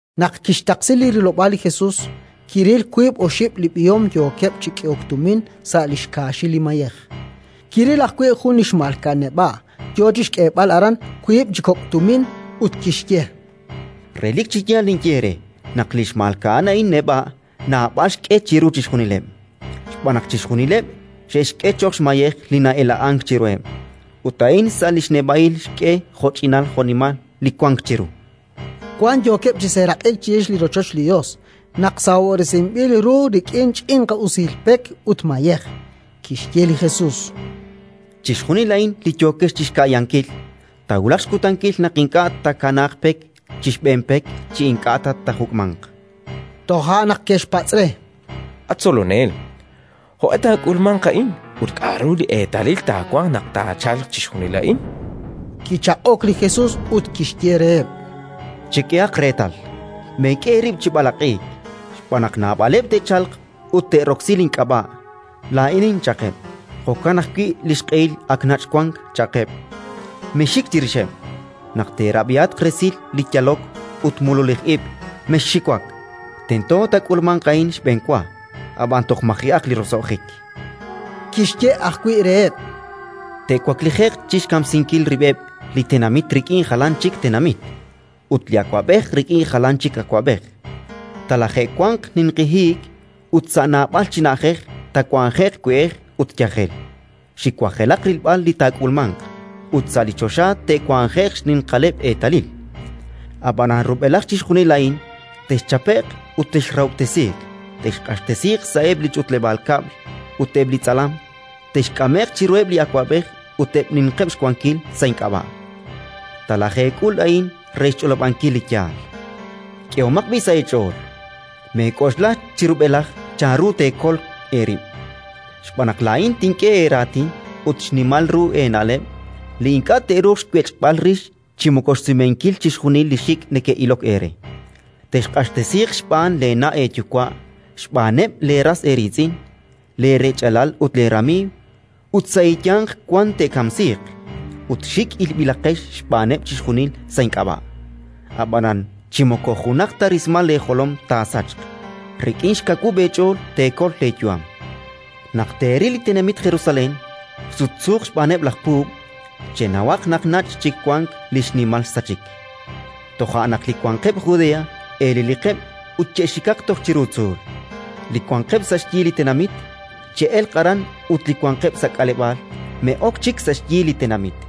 Naq kixtaqsi li rilob'aal li Jesus, kiril wiib' oxib' li b'ihom yookeb' chi k'ehok tumin sa' li xkaaxil li mayej. Kiril ajwi' jun li xmalka'an neb'a' yo chi xk'eeb'al aran wiib' chi kok' tumin, ut kixye: —Relik chi yaal ninye eere naq li xmalka'an a'in neb'a' naab'al xk'e chiru chixjunileb'. Xb'aan naq chixjunileb' xe'xk'e cho'q xmayej li na'ela'ank chiruheb'; ut a'in sa' li xneb'a'il xk'e jo'ch'inal jo'nimal li wank chiru. Wan yookeb' chi seeraq'ik chirix li rochoch li Yos naq sahob'resinb'il ru rik'in ch'inqi usil pek ut mayej. Kixye li Jesus: “Chixjunil a'in li yookex chi xka'yankil, taawulaq xkutankil naq ink'a' taakanaaq pek chi xb'een pek chi ink'a' ta taajuk'manq”. Toja' naq ke'xpatz' re: —At Tzolonel, jo'q'e taak'ulmanq a'in ut k'aru li eetalil taawanq naq taachalq chixjunil a'in? Kichaq'ok li Jesus ut kixye reheb': “Chek'ehaq reetal, meek'e eerib' chi b'alaq'iik. Xb'aan naq naab'aleb' te'chalq ut te'roksi link'ab'a': «Laa'inin», cha'qeb'; jo'kan ajwi': «Li xq'ehil ak nach' wank», cha'qeb'. Mexxik chirixeb'. Naq teerab'ihatq resil li yalok ut mululij ib', mexxiwak: tento taak'ulmanq a'in xb'enwa; ab'an toj maji'aq li roso'jik”. Kixye ajwi' reheb': “Te'waklije'q chi xkamsinkil rib'eb' li tenamit rik'in jalan chik tenamit, ut li awab'ej rik'in jalan chik awab'ej. Talaje'wanq ninqi hiik ut, sa' naab'al chi na'ajej, taawanje'q we'ej ut yajel; xiwajelaq rilb'al li taak'ulmanq, ut sa' li choxa te'wanje'q xninqaleb' eetalil. “Ab'anan rub'elaj chixjunil a'in texchape'q ut texrahob'tesiiq; texq'axtesiiq sa'eb' li ch'utleb'aal kab'l ut eb' li tz'alam; texk'ame'q chiruheb' li awab'ej ut eb' li ninqeb' xwankil sa' ink'ab'a'. Talajeek'ul a'in re xch'olob'ankil li yaal. K'ehomaq b'i' sa' eech'ool: meek'oxla chi rub'elaj chanru teekol eerib', xb'aan naq laa'in tink'e eeraatin ut xnimal ru eena'leb' li ink'a' te'ruuq xwech'b'al rix chi moko xsumenkil chixjunileb' li xik' neke'ilok eere. “Texq'axtesiiq xb'aan leena' eeyuwa', xb'aaneb' leeras eeriitz'in, leerech'alal ut leeramiiw, ut sa' eeyanq wan te'kamsiiq; ut xik' ilb'ilaqex xb'aaneb' chixjunil sa' ink'ab'a'. Ab'anan chi moko junaq ta rismal leejolom taasachq. Rik'in xkawub' eech'ool teekol leeyu'am. “Naq teeril li tenamit Jerusalén sutsuuq xb'aaneb' laj puub', chenawaq naq nach' chik wank li xnimal xsachik. Toja' naq li wanqeb' Judea eleliqeb' ut che'xikaq toj chiru tzuul; li wanqeb' sa' xyi li tenamit, che'elq aran ut li wanqeb' sa' k'aleb'aal me'ok chik sa' li tenamit,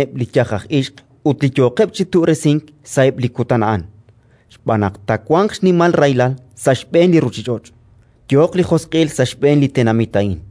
“Ra chaalel sa' xb'eeneb' li yaj aj ixq ut li yooqeb' chi tu'resink sa'eb' li kutan a'an, xb'aan naq taawanq xnimal rahilal sa' xb'een li ruuchich'och', yooq li josq'il sa' xb'een li tenamit a'in.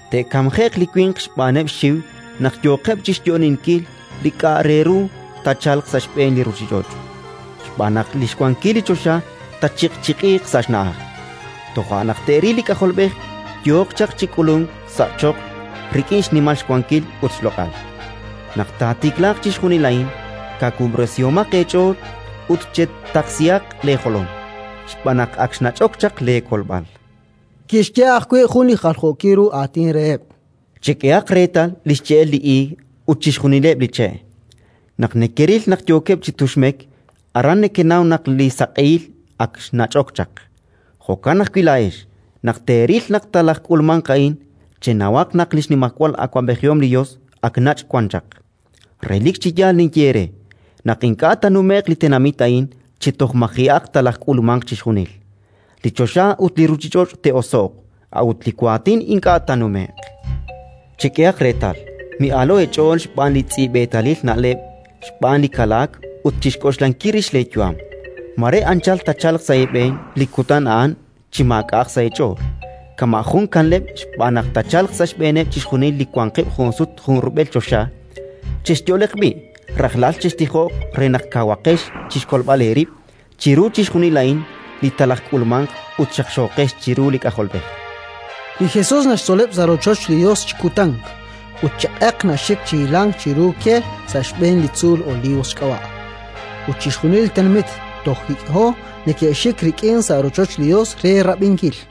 te'kamje'q li winq xb'aaneb' xxiw naq yooqeb' chi xyo'oninkil li k'a' re ru taachalq sa' xb'een li ruuchich'och', xb'aan naq li xwankilal li choxa taachiq'chiq'iiq sa' xna'aj. Toja' naq te'ril li K'ajolb'ej yooq chaq chi k'ulunk sa' choql rik'in xnimal xwankil ut xloq'al. Naq taatiklaaq chixjunil a'in, kawub'resihomaq eech'ool ut chetaqsihaq leejolom, xb'aan naq ak xnach'ok chaq leekolb'al”. Kixye ajwi' jun li jaljookil ru aatin reheb': “Chek'ehaq reetal li xche'el li iig ut chixjunileb' li che'. Naq nekeril naq yookeb' chi tuxmek, aran nekenaw naq li saq'ehil ak xnach'ok chaq. Jo'kan ajwi' laa'ex, naq teeril naq talajk'ulmanq a'in, chenawaq naq li xnimajwal awab'ejihom li Yos ak nach' wan chaq. “Relik chi yaal ninye eere naq ink'a' taanume'q li tenamit a'in chi toj maji'aq talajk'ulmanq chixjunil. Li choxa ut li ruuchich'och' te'oso'q, a'ut li waatin ink'a' taanume'q. “Chek'ehaq reetal, mi'aalo'k eech'ool xb'aan li tz'i'b'eetalil na'leb', xb'aan li kalaak ut chi xk'oxlankil rix leeyu'am. Mare anchal taachalq sa' eeb'een li kutan a'an chi maak'a'aq sa' eech'ool, kama' jun li kanleb'. Xb'aan naq taachalq sa' xb'eeneb' chixjunil li wanqeb' junsut junrub'el choxa. Chexyo'leq b'i'; rajlal chextijoq re naq kawaqex chi xkolb'al eerib' chiru chixjunil a'in li talajk'ulmanq ut xaqxooqex chiru li K'ajolb'ej”. Li Jesus naxtzoleb' sa' rochoch li Yos chi kutan, ut chi q'eq naxik chi hilank chiru ke sa' xb'een li tzuul Olivos xk'ab'a'; ut chixjunil li tenamit toj hik'ho neke'xik rik'in sa' rochoch li Yos re rab'inkil.